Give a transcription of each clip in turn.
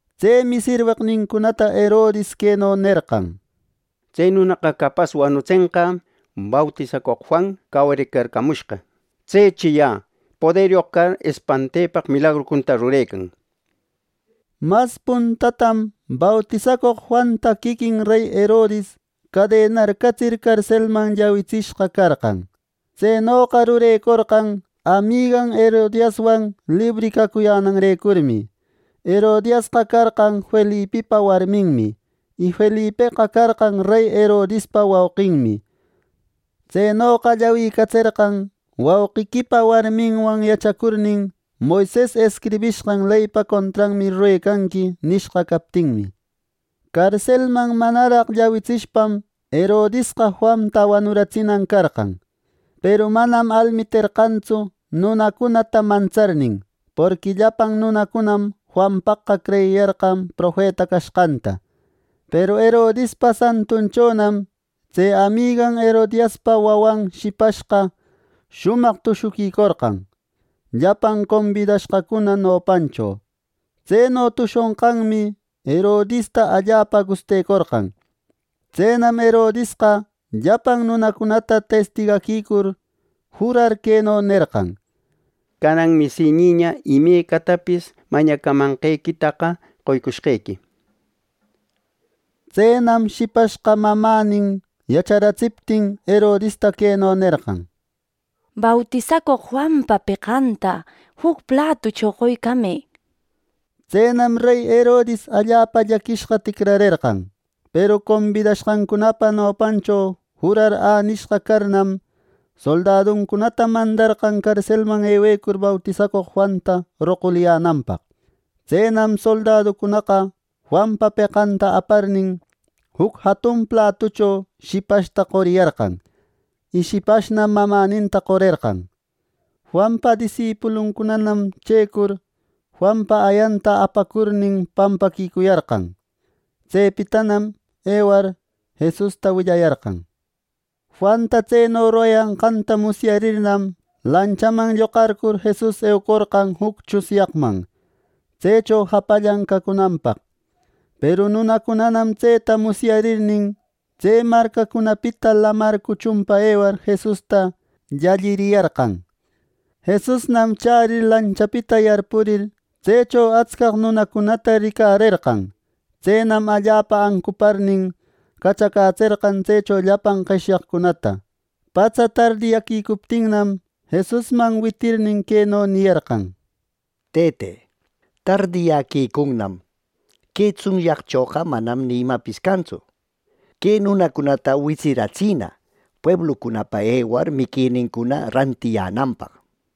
Tsemi sirweqnincunata Herodis queno nerqan: —Tse nunaqa capas wanutsenqä bautisacoq Juan cawaricarcamushqa. Tsechi ya poderyoq car espantepaq milagrucunata rurecan —nir. Mas puntatam bautisacoq Juanta quiquin rey Herodis cadenarcatsir carselman llawicatsishqa carqan. Tsenoqa rurecorqan amigan Herodiaswan libri cacuyänanrecurmi. Herodiasqa carqan Felipipa warminmi, y Felipeqa carqan rey Herodispa wauqinmi. Tsenoqa llawicatserqan, “¡Wauquiquipa warminwan yachacurnin, Moises escribishqan leypa contranmi rurecanqui!” nishqa captinmi. Carselman manaraq llawitsishpam Herodisqa Juanta wanuratsinan carqan; peru manam almiterqantsu nunacunata mantsarnin, porqui llapan nunacunam Juanpaqqa creyiyarqan profeta cashqanta. Peru Herodispa santunchonam tse amigan Herodiaspa wawan shipashqa shumaq tushuquicorqan, llapan combidashqacuna nopancho. Tseno tushonqanmi Herodista allapa gustecorqan. Tsenam Herodisqa llapan nunacunata testigaquicur, jurar queno nerqan: —¡Cananmi si niña, imecatapis mañamanqequitaqa qoycushqequi! —nir. Tsenam shipashqa mamänin yacharatsiptin Herodista queno nerqan: —Bautisacoq Juanpa peqanta juc platucho qoycamë —nir. Tsenam rey Herodis allapa llaquishqa ticrarerqan; peru combidashqancunapa nopancho jurar änishqa carnam, soldaduncunata mandarqan carselman ewecur bautisacoq Juanta roquliyänanpaq. Tsenam soldaducunaqa Juanpa peqanta aparnin, juc jatun platucho shipashta qoriyarqan, y shipashnam mamäninta qorerqan. Juanpa disipuluncunanam checur, Juanpa ayanta apacurnin pampaquicuyarqan. Tsepitanam ewar Jesusta willayarqan. Juanta tseno rurayanqanta musyarirnam, lanchaman lloqarcur Jesus eucorqan juc tsunyaqman, tsecho japallan cacunanpaq. Peru nunacunanam tseta musyarirnin, tse marcacunapita lamar cuchunpa ewar Jesusta llalliriyarqan. Jesusnam chärir lanchapita yarpurir, tsecho atscaq nunacunata ricarerqan. Tsenam allapa ancuparnin, cachacätserqan tsecho llapan qeshyaqcunata. Patsa tardiyäquicuptinnam, Jesusman witirirnin, queno niyarqan: —Tëte, tardiyäquicunnam. Que tsunyaqchoqa manam ni imapis cantsu. Que nunacunata witsiratsina pueblucunapa ewar miquinincuna rantiyänanpaq —nir.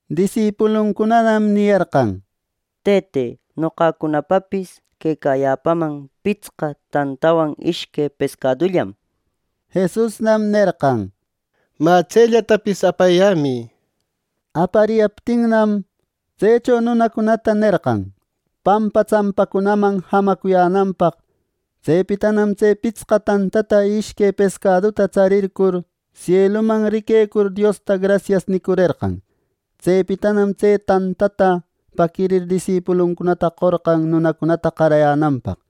Disipuluncunanam niyarqan: —Tëte, noqacunapapis quecayäpaman pitsqa tantawan ishque pescadullam —nir. Jesusnam nerqan: —Mä tsellatapis apayämï —nir. Apariyaptinnam, tsecho nunacunata nerqan pampa tsampacunaman jamacuyänanpaq. Tsepitanam tse pitsqa tantata y ishque pescaduta tsarircur sieluman riquecur, Diosta “Grasias” nicurerqan. Tsepitanam tse tantata paquirir disipuluncunata qorqan nunacunata qarayänanpaq.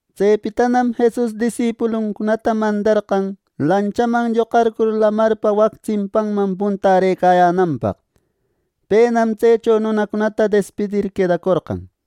Tsepitanam Jesus disipuluncunata mandarqan lanchaman lloqarcur lamarpa wac tsimpanman puntärëcayänanpaq. Penam tsecho nunacunata despidir quedacorqan.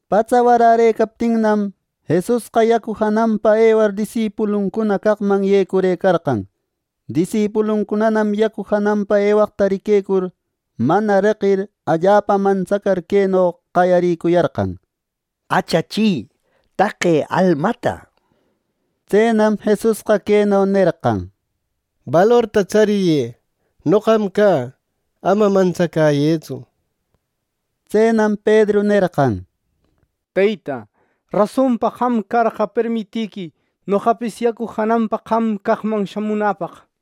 Patsa warärëcaptinnam, Jesusqa yacu jananpa ewar disipuluncuna caqman yecurëcarqan. Disipuluncunanam yacu jananpa ewaqta riquecur, mana reqir, allapa mantsacar, queno qayarïcuyarqan: —¡Achachi! ¡Taqe almata! —nir. Tsenam Jesusqa queno nerqan: —Balorta tsariyë. Noqam cä. Ama mantsacäyëtsu —nir. Tsenam Pedru nerqan: —Teyta, rasonpa qam carqa, permitiquï noqapis yacu jananpa qam caqman shamunäpaq —nir.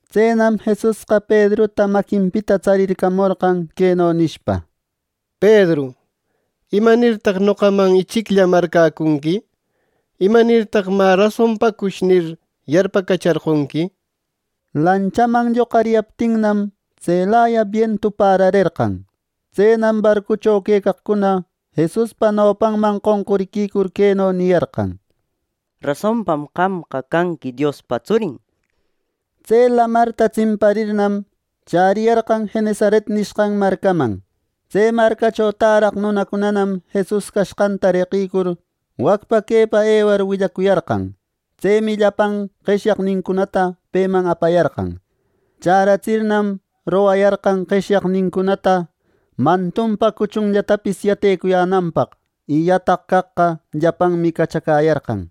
Tsenam Jesusqa Pedruta maquinpita tsarircamorqan queno nishpa: —Pedru, ¿Imanirtaq noqaman ichiclla marcäcunqui! ¿Imanirtaq, ‘Mä rasonpacush’ nir, yarpacacharqonqui! Lanchaman lloqariyaptinnam, tselaya bientu pärarerqan. Tsenam barcucho quecaqcuna Jesuspa nopanman qonquriquicur queno niyarqan: —¡Rasonpam qamqa canqui Diospa tsurin! —nir. Tse lamarta tsimparirnam, chäriyarqan Genesaret nishqan marcaman. Tse marcacho täraq nunacunanam Jesus cashqanta reqïcur, wacpa quepa ewar willacuyarqan. Tsemi llapan qeshyaqnincunata peman apayarqan. Chäratsirnam, rogayarqan qeshyaqnincuna mantunpa cuchunllatapis yatecuyänanpaq. Y yataq caqqa llapanmi cachacäyarqan.